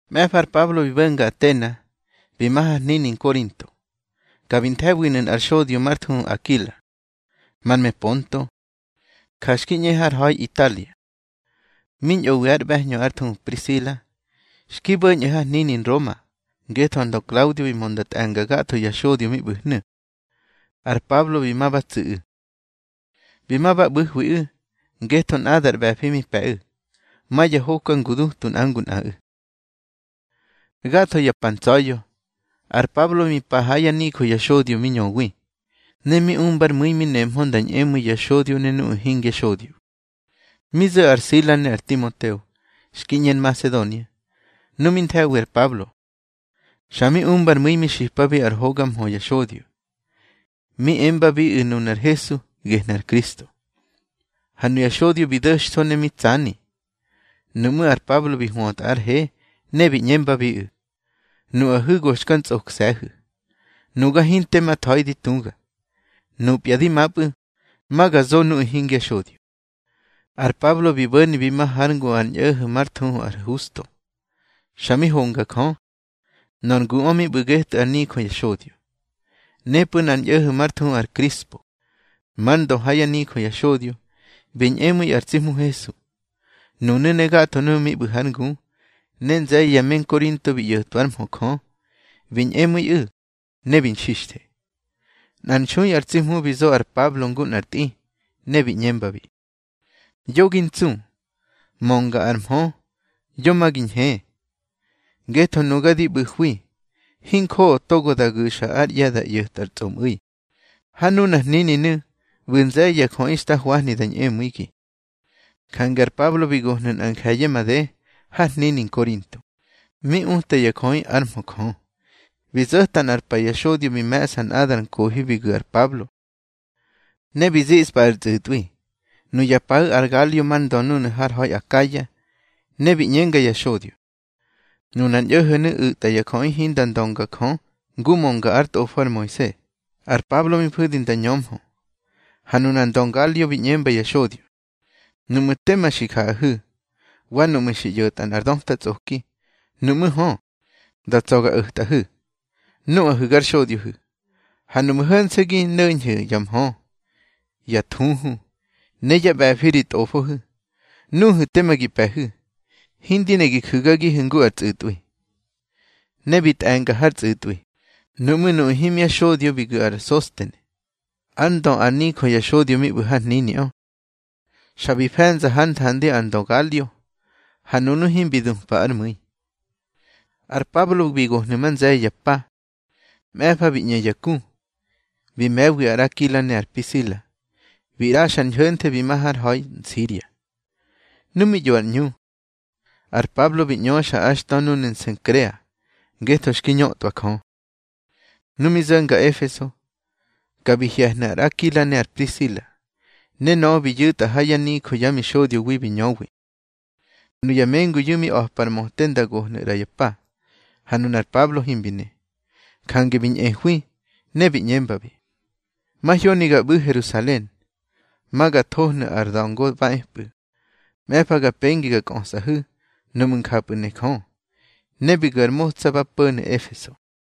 Mꞌe̱fa ar Pablo bi bo̱nga Atena, bi ma har hnini Nkorinto. Ka bi nthe̱winu̱ nꞌar xodyo már thuhu Akila, mar me Ponto. Ja xki ꞌñe har ha̱i Italia, mi ñꞌowi ár ꞌbe̱hñö, ár thuhu Prisila. Xki bo̱ñꞌu̱ har hnini Nroma, ngetho ar ndö Klaudio bi mö nda tꞌe̱nga gatho ya xodyo mi ꞌbu̱hnu̱. Ar Pablo bi ma ba tsu̱ꞌu̱. Bi ma ba ꞌbu̱hwiꞌu̱, ngetho nꞌadar ꞌbe̱fi mi pe̱ꞌu̱, ma ya hoka ngudutu nꞌa ngu nꞌaꞌu̱. Gatho ya pa ntsa̱ya̱, ar Pablo mi pa ha yá nijö ya xodyo mi ñöwi. Ne mi umbár mu̱i mi nehmö nda ñꞌemu̱i ya xodyo ne nuꞌu̱ hingya xodyo. Mi zo̱ ar Sila ne ar Timoteo, xki ꞌñe Nmasedonia. Nu mi nthe̱wi ar Pablo, xa mi umbár mu̱i mi xipabi ar hoga mhö ya xodyo, mi embabiꞌu̱ nunar Hesu gehnu̱ ar Kristo. Ha nuya xodyo bi do̱xtho ne mi tsani. Nuꞌmú̱ ar Pablo bi hwötꞌa ár he, ne bi ꞌñembabiꞌu̱: —Nuꞌahu̱ go xka ntsꞌokse̱hu̱. Nuga hinte ma tha̱i di tuga. Nupya di mapꞌu̱ ma ga zo nuꞌu̱ hingya xodyo. Ar Pablo bi bo̱ni bi ma hár ngu nꞌar ñꞌo̱ho̱ már thuhu ar Husto, xa mi honga Jö. Nor nguꞌö mi ꞌbu̱ getꞌu̱ ár nijö ya xodyo. Nepꞌu̱ nꞌar ñꞌo̱ho̱ már thuhu ar Krispo, már ndö ha yá nijö ya xodyo, bi ñꞌemu̱i ar tsi Hmu Hesu, nunu̱ ne gatho nuꞌu̱ mi ꞌbu̱ hár ngu. Ne nze̱ye̱ ya me Nkorinto bi ꞌyo̱twa ár mhö Jö, bi ñꞌemu̱iꞌu̱, ne bi nxixthe. Nꞌar nxui ar tsi Hmu bi zo ar Pablo ngu nꞌar tꞌi, ne bi ꞌñembabi: —Yo gi ntsu, mönga ar mhö, yo ma gi ñhe. Ngetho nuga di ꞌbu̱hwi, hinjoꞌo togo da gu̱xa ár ꞌye̱ da ꞌyo̱tꞌar tsꞌomꞌu̱i. Ha nunar hnininu̱ ꞌbu̱ nze̱ye̱ ya jöꞌi xta hwahni da ñꞌemu̱igi. Jange ar Pablo bi gohnu̱ nꞌa nje̱ye̱ made har hnini Nkorinto, mi utwa ya jöꞌi ár mhö Jö. Bi zo̱ta nꞌar pa ya xodyo bi me̱ꞌsa nꞌadar nkohi bi gu̱ ar Pablo, ne bi ziꞌspa ar tsꞌu̱tꞌwi. Nuya paꞌu̱ ar Galio mar ndö núnu̱ har ha̱i Akaya. Ne bi ꞌñenga ya xodyo: —Nunar ñꞌo̱ho̱nu̱ u̱tꞌa ya jöꞌi hinda ndönga Jö ngu mönga ár tꞌofo ar Moise. Ar Pablo mi fu̱di nda ñömhö, ha nunar ndö Galio bi ꞌñemba ya xodyo: —Nuꞌmu̱ tema xi jaꞌahu̱, wa nuꞌmu̱ xi ꞌyo̱tꞌa nꞌar döta tsꞌoki, nuꞌmú̱ hö, da tsa̱ ga o̱tꞌahu̱, nuꞌahu̱ gar xodyohu̱. Ha nuꞌmu̱ ho̱nse̱ gi no̱ñhu̱ ya mhö, ya thuhu, ne yá ꞌbe̱fi ri tꞌofohu̱, nuhu̱ tema gi pe̱hu̱. Hindi ne gi ju̱gagihu̱ ngu ar tsꞌu̱tꞌwi. Ne bi tꞌe̱nga hár tsꞌu̱tꞌwi. Nuꞌmú̱ nuꞌu̱ himya xodyo bi gu̱ ar Sostene, ár ndö ár nijö ya xodyo mi ꞌbu̱ har hniniꞌö, xa bi fe̱nza hár nthandi ar ndö Galio, ha nunu̱ himbi dupa ár mu̱i. Ar Pablo bi gohnu̱ ma nze̱ye̱ ya pa. Mꞌe̱fa bi ꞌñe ya ku, bi me̱wi ar Akila ne ar Prisila, bi ꞌraxa ar ñho̱nthe bi ma har ha̱i Nsiria. Nu mi ꞌyo ar ꞌñu, ar Pablo bi ꞌñöxa ár xtö núnu̱ Nsenkrea, ngetho xki ñötꞌwa Jö. Nu mi zo̱nga Efeso, ka bi hye̱hnu̱ ar Akila ne ar Prisila, ne nöꞌö bi yu̱tꞌa ha yá nijö yá mixodyowi mi ñöwi. Nuya mengunu̱ mi a̱par möte nda gohnu̱ ꞌra ya pa, ha nunar Pablo himbi ne. Jange bi ñꞌehwi, ne bi ꞌñembabi: —Mahyoni ga ꞌbu̱ Herusalen, ma ga thohnu̱ ar da̱ngo ba epꞌu̱. Mꞌe̱fa ga pengi ga kꞌösꞌahu̱, nuꞌmu̱ njapꞌu̱ ne Jö. Ne bi gu̱ ar motsa ba po̱nu̱ Efeso.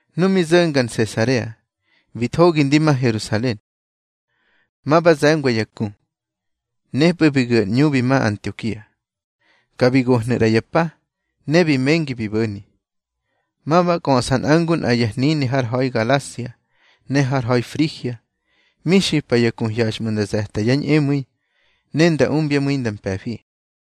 Nu mi zo̱nga Nsesarea, bi thogi ndi ma Herusalen, ma ba ze̱ngwa ya ku. Nepꞌu̱ bi gu̱ ar ꞌñu bi ma Antiokia. Ka bi gohnu̱ ꞌra ya pa. Ne bi mengi bi bo̱ni, ma ba kꞌöꞌsa nꞌa ngu nꞌa ya hnini har ha̱i Galasia, ne har ha̱i Frigia. Mi xipa ya ku hyaxꞌmu̱ nda ze̱ta yá ñꞌemu̱i, nda umbyá mu̱i nda mpe̱fi.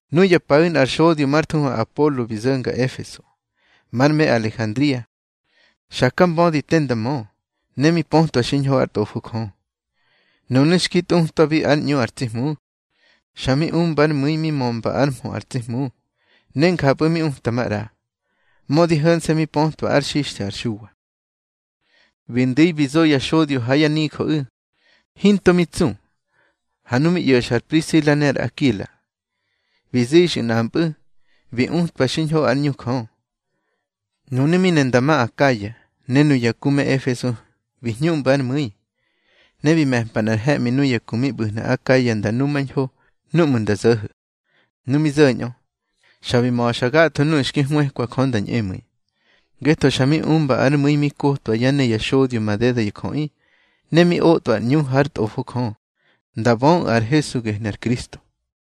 Nuya paꞌu̱ nꞌar xodyo már thuhu Apolo bi zo̱nga Efeso. Mar me Alejandria, xaka mbödi te nda mö, ne mi pötwa xiñho ár Tꞌofo Jö. Nunu̱ xki tꞌutꞌwabi ár ꞌñu ar tsi Hmu, xa mi umba ár mu̱i mi mömba ár mhö ar tsi Hmu, ne njapꞌu̱ mi uta maꞌra, mödi ho̱nse̱ mi pötwa ár xixthe ar Xuwa. Bi ndu̱i bi zo ya xodyo ha yá nijöꞌu̱, hinto mi tsu. Ha nu mi ꞌyo̱xa ar Prisila ne ar Akila, bi zixyu̱ nꞌampꞌu̱, bi utwabi xiñho ár ꞌñu Jö. Nunu̱ mi ne nda ma Akaya, ne nuya ku me Efeso bi hñuꞌmba ár mu̱i. Ne bi me̱mpa nꞌar he̱ꞌmi nuya ku mi ꞌbu̱hnu̱ Akaya nda numañho núꞌmu̱ nda zo̱ho̱. Nu mi zo̱ñꞌö, xa bi ma̱xa gatho nuꞌu̱ xki hwëkwa Jö nda ñꞌemu̱i. Ngetho xa mi umba ár mu̱i mi kotwa yá ne ya xodyo madeda ya jöꞌi, ne mi otꞌwa ar ꞌñu hár Tꞌofo Jö, nda böꞌu̱ ar Hesu gehnu̱ ar Kristo.